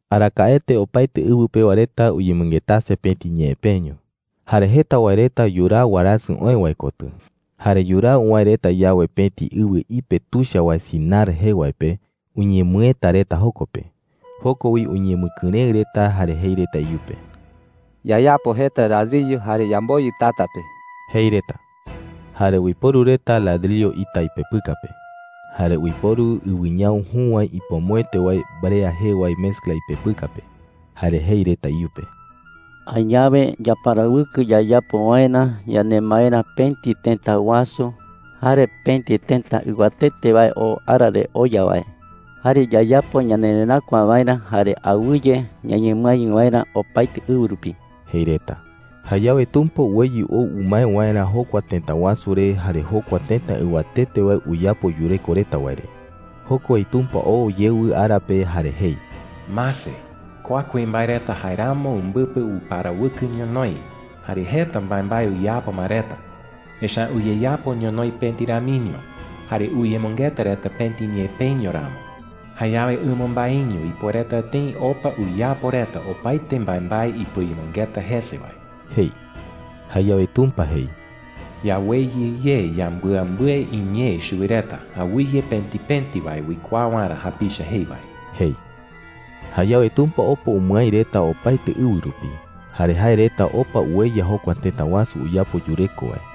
Arakaete opaete ɨwɨ pewa reta uyemɨngetase pëti ñee peño. Jare jeta wae reta yuraa warasɨ oë wae kotɨ. Jare yuraa uwäe reta yawe pëti ɨwɨ ipe tuicha wae Sinar jee wae pe, uñemɨëta reta joko pe. Joko wi uñemɨkɨrëɨ reta jare jei reta iyupe: “Yayapo jeta ladriyo jare yamboyɨ tata pe,” jei reta. Jare uiporu reta ladriyo ita ipepɨka pe. Jare uiporu ɨwɨñau jü wae ipomoete wae “brea” jee wae mezcla ipepɨka pe. Jare jei reta iyupe: “Añawe yaparawɨkɨ yayapo waerä yanemaerä pëti tëta wasu jare pëti tëta ɨwatete wae oo ara re oya wae. Jare yayapo ñanereräkua waerä jare awɨye ñañemɨái waerä opaete ɨwɨ rupi,” jei reta. Jayawe Tumpa uweyɨ ou umae waerä jokua tëta wasu re jare jokua tëta ɨwatete wae uyapo yureko reta wae re. Joko wi Tumpa oo yewɨ ara pe jare jei: “¡Mase! Kua kuimbae reta jaeramo umbɨpɨ uparawɨkɨ ñonoï jare jeta mbaembae uyapo ma reta, echa’ä uyeyapo ñonoï pëti ramiño jare uyemɨngeta reta pëti ñee peño ramo. Jayawe ɨmambaeño ipuereta tëi opa uyapo reta opaete mbaembae ipɨayemɨngeta jese wae,” jei. Jayawe Tumpa jei: “Yaweyɨ ye yambɨambɨe iñee chuwi reta awɨye pëti pëti wae uikuaa waerä japicha jei wae,” jei. Jayawe Tumpa opa umɨái reta opaete ɨwɨ rupi. Jare jae reta opa ueya jokua tëta wasu uyapo yureko wae.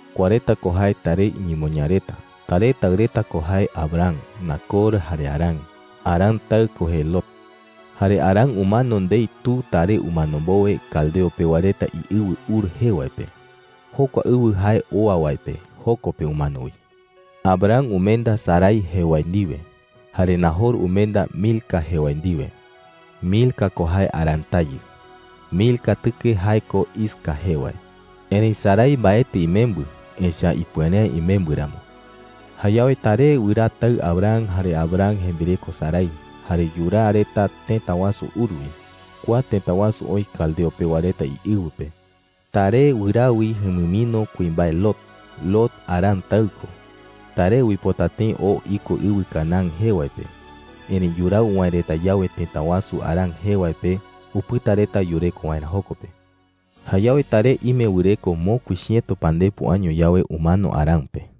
Kua reta ko jae Taré iñemoñaa reta: Taré taɨ reta ko jee Abram, Nacor, jare Harán. Harán taɨ ko jee Lot. Jare Harán umano ndei tu Taré umano mbowe caldeo pewa reta iɨwɨ Ur jee wae pe. Jokua ɨwɨ jae oa wae pe, joko pe umano wi. Abram umenda Sarai jee wae ndiwe. Jare Najor umenda Milca jee wae ndiwe. Milca ko jae Harán tayɨ. Milca tɨke jae ko Isca jee wae. Erëi Sarai mbaetɨ imembɨ, echa’ä ipuere’ä imembɨ ramo. Jayawe Taré wɨraa taɨ Abram jare Abram jembireko Sarai, jare yuraa reta tëta wasu Ur wi. Kua tëta wasu oï caldeo pewa reta iɨwɨ pe. Taré wɨraa wi jumɨmino kuimbae Lot. Lot Harán taɨ ko. Taré uipota tëi oo iko ɨwɨ Canaán jee wae pe. Erëi yuraa uwäe reta yawe tëta wasu Harán jee wae pe, upɨta reta yureko waerä joko pe. Jayawe Taré ime wɨreko mokui chiëto pandepo año yawe, umano Harán pe.